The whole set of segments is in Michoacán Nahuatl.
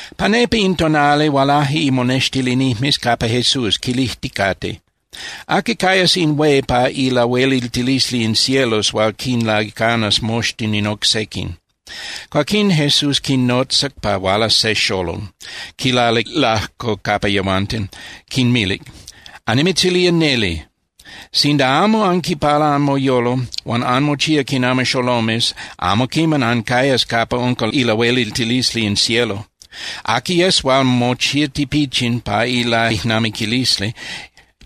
Pa nepa in tonali hualaje imonextilinijmes capa Jesús quilijticate: —¿Aqui cayas in hué pa ilahueliltilisli in cielos hual quinlaicanas moxtin in oc sequin? Cuaquín Jesús quinotzac pa hualas se xolol, quilalic lajco capa yehuanten. Quinmilic: —Annimitzilía neli, sinda amo anquipala anmoyolo huan anmochía quinami xolomes, amo quiman ancayas capa unca ilahueliltilisli in cielo. Aqui yes hual mochía tipichin pa ilaijnamiquilisli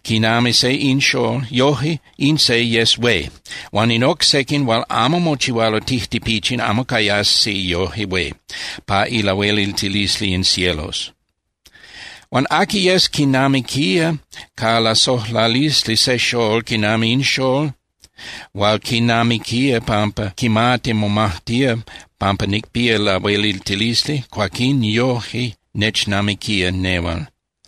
quinami in xól, yoje in se yes hué. Huan in oc sequin hual amo mochihualo tijtipichin amo cayasi yoje hué pa ilahueliltilisli in cielos. Huan aqui yes quinamiquía ca lasojlalisli se xól quinami in xól huan quinamiquía pampa quimati momajtía pampa nicpía lahueliltilisli, cuaquín yoje nechnamiquía nehual.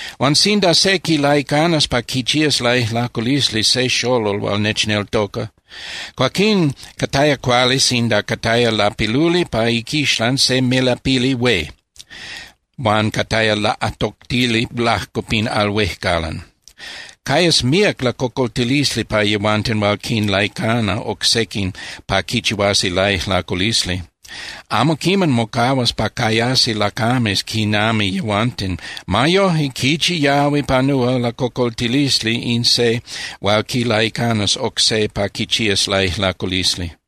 ’Huan sinda se quilaicanas pa quichías laijlaculisli se xolol hual nechneltoca, cuaquín cataya cuali sinda cataya lapiluli pa iquixlan se melapili hué huan cataya laꞌatoctili lajco pin al huejcalan. ¡Cayas míac lacocoltilisli pa yehuanten hual quinlaicana oc sequin pa quichihuasi laijlaculisli! Amo quiman mocahuas pa cayasi lacames quinami yehuanten. Ma yoje, ¡quichi yahui panúa lacocoltilisli in se hual quilaicanas oc se pa quichías laijlaculisli!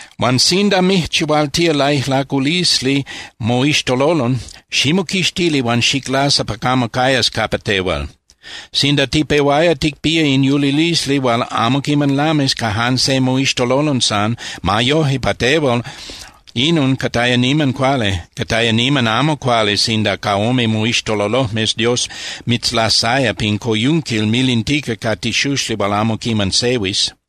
Huan sinda mijchihualtía laijlaculisli moixtololon, ximoquixtili huan xiclasa pa camo cayas capa tehual. Sinda tipehuaya ticpía in yulilisli hual amo quiman lamis ca jan se moixtololon san, ma yoje, pa tehual inon cataya niman cuali. Cataya niman amo cuali sinda ca ome moixtololojmes Dios mitzlasaya pin coyunquil milintica ca tixuxli hual amo quiman sehuis.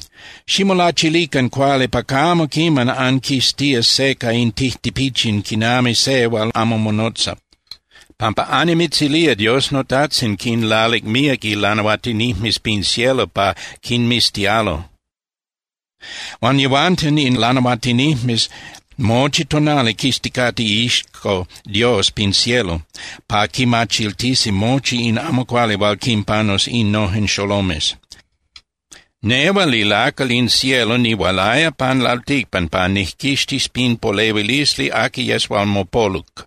’Ximolachilican cuali pa camo quiman anquiztías se ca in tijtipichin quinami se hual amo monotza, pampa annimitzilía Dios noTajtzin quinlalic míac ilanahuatinijmes pin cielo pa quinmiztialo. Huan yehuanten in lanahuatinijmes mochi tonali quizticate iixco Dios pin cielo pa quimachiltisi mochi in amo cuali hual quinpanus innojen xolomes. Nehual ilacal in cielo, nihualaya pan lalticpan pa nijquixtis pin polehuilisli aqui yes hual mopoluc.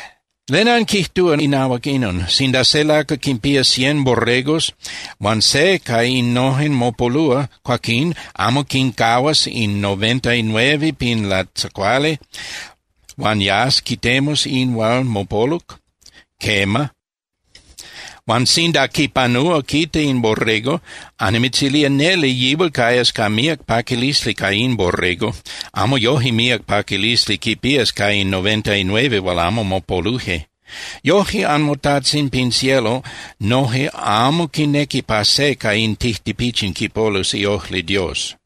’¿Len anquijtúa inahuac inon? Sinda se lacal quinpía cien borregos huan se ca innojen mopolúa, cuaquín ¿amo quincahuas in noventainueve pin latzacuali huan yas quitemus in se hual mopoluc? Quema. Huan sinda quipanúa quita in borrego, annimitzilía neli yihual cayas ca míac paquilisli ca in borrego. Amo yoje míac paquilisli quipías ca in noventainueve hual amo mopoluje. Yoje anmoTajtzin pin cielo noje amo quinequi pa se ca in tijtipichin quipolus iojli Dios.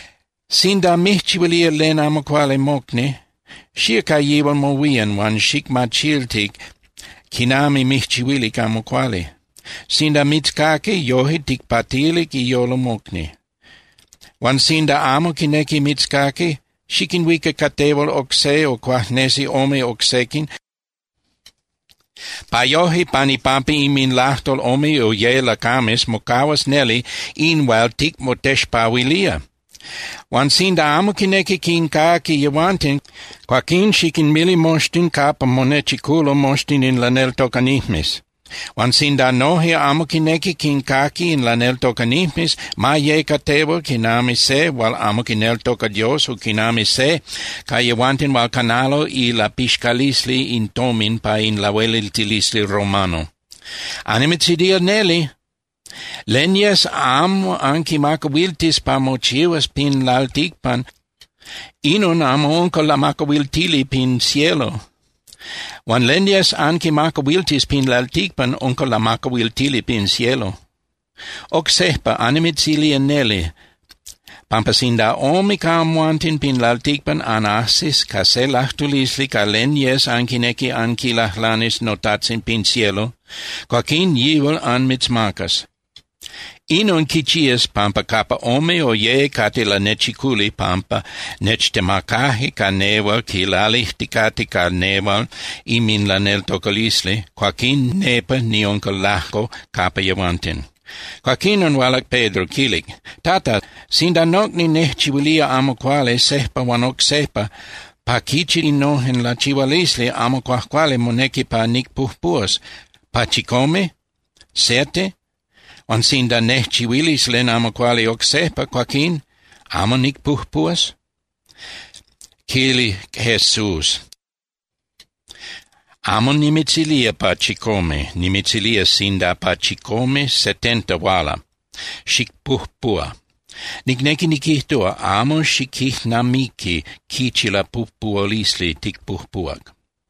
’Sinda mijchihuilía len amo cuali mocni, xía ca yihual mohuían huan xicmachilti quinami mijchihuilic amo cuali. Sinda mitzcaqui, yoje ticpatilic iyolo mocni. Huan sinda amo quinequi mitzcaqui, xiquinhuica ca tehual oc se o cuajnesi ome oc sequin, pa yoje pan ipampa inminlajtol ome o ye lacames mocahuas neli in hual ticmotexpahuilía. Huan sinda amo quinequi quincaqui yehuanten, cuaquín xiquinmili moxtin capa monechiculo moxtin in laneltocanijmes. Huan sinda noje amo quinequi quincaqui in laneltocanijmes, ma ye ca tehual quinami se hual amo quineltoca Dios o quinami se ca yehuanten hual canalo ilapixcalisli in tomin pa in lahueliltilisli romano. ’Annimitzilía neli, len yes amo anquimacahuiltis pa mochihuas pin lalticpan, inon amo unca lamacahuiltili pin cielo. Huan len yes anquimacahuiltis pin lalticpan unca lamacahuiltili pin cielo. ’Oc sejpa, annimitzilía neli pampa sinda ome ca amhuanten pin lalticpan anajsis ca se lajtulisli ca len yes anquinequi anquilajlanis noTajtzin pin cielo, cuaquín yihual anmitzmacas. Inon quichías, pampa capa ome o ye cate lanechiculi pampa nechtemacaje ca nehual quilalijticate ca nehual inminlaneltocalisli, cuaquín nepa niunca lajco capa yehuanten. Cuaquinon hualac Pedro, quilic: —Tata, sinda nocni nejchihuilía amo cuali sejpa huan oc sejpa, ¿pa quichi innojen lachihualisli amo cuajcuali monequi pa nicpujpuhuas, pa chicome (siete)? Huan sinda nejchihuilis len amo cuali oc sejpa, cuaquín ¿amo nicpujpuhuas? Quilic Jesús: —Amo nimitzilía pa chicome. Nimitzilía sinda pa chicome setenta huala, xicpujpuhua. Nicnequi niquijtúa, amo xiquijnamiqui quichi lapujpuhualisli ticpujpuhuac.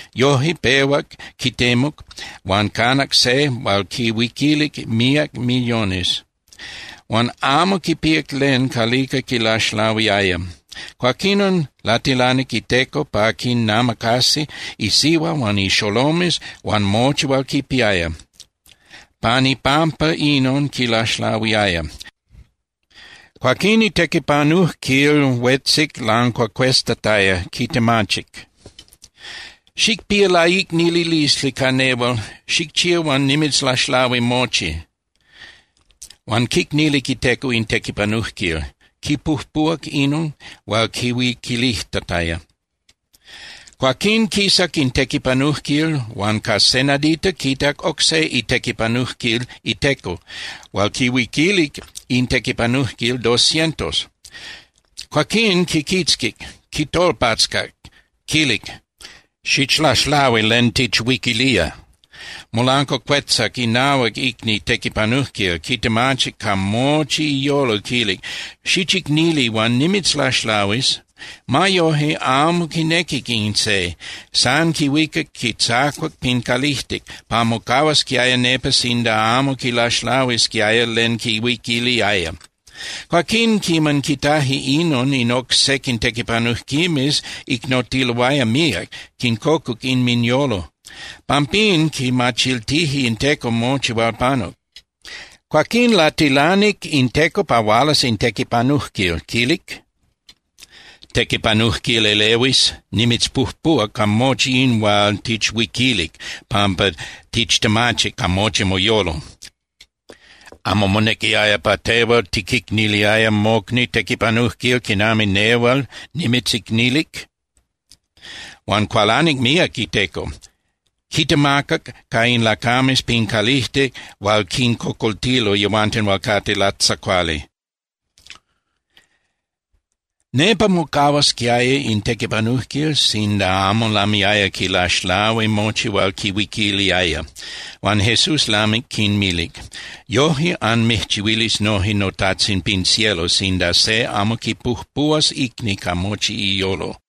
Yoje, pehuac quitemuc huan canac se hual quihuiquilic míac millones. Huan amo quipíac len calica quilaxlahuiaya. Cuaquinon latilanic iteco pa quinamacasi isihua huan ixolomes huan mochi hual quipiaya. Pan ipampa inon quilaxlahuiaya. Cuaquín itequipanujquil huetzic lancuacueztataya, quitemachic: “Xicpía laicnililisli ca nehual, xijchía huan nimitzlaxlahuis mochi.” Huan quicnilic iteco in tequipanujquil, quipujpuhuac inon hual quihuiquilijtataya. Cuaquín quisac in tequipanujquil huan ca se nadita quitac oc se itequipanujquil iteco hual quihuiquilic in tequipanujquil dos cientos. Cuaquín quiquitzquic, quitolpatzcac, quilic: “¡Xichlaxlahui len tichhuiquilía!” Molancuacuetzac inahuac icni tequipanujquil, quitemachic ca mochi iyolo, quilic: “¡Xichicnili, huan nimitzlaxlahuis!” Ma yoje, amo quinequic in se, san quihuicac quitzacuac pin calijtic pa mocahuasquiaya nepa sinda amo quilaxlahuisquiaya len quihuiquiliaya. Cuaquín, quiman quitaje inon, in oc sequin tequipanujquimes icnotiloaya míac, quincocuc inminyolo. Pampín quimachiltije in teco mochi hual panuc. Cuaquín latilanic in teco pa hualas in tequipanujquil, quilic: “¡Tequipanujquil elehuis! Nimitzpujpuhuac ca mochi in hual tichhuiquilic pampa tichtemachic ca mochi moyolo. ¿Amo monequiaya pa tehual tiquicniliaya mocni tequipanujquil quinami nehual nimitzicnilic?” Huan cualanic míac iteco, quitemacac ca in lacames pin calijtic hual quincocoltilo yehuanten hual cate latzacuali. Nepa mocahuasquiaya in tequipanujquil sinda amo lamiaya quilaxlahui mochi hual quihuiquiliaya. Huan Jesús lamic quinmilic: —Yoje anmijchihuilis noje noTajtzin pin cielo sinda se amo quipujpuhuas icni ca mochi iyolo.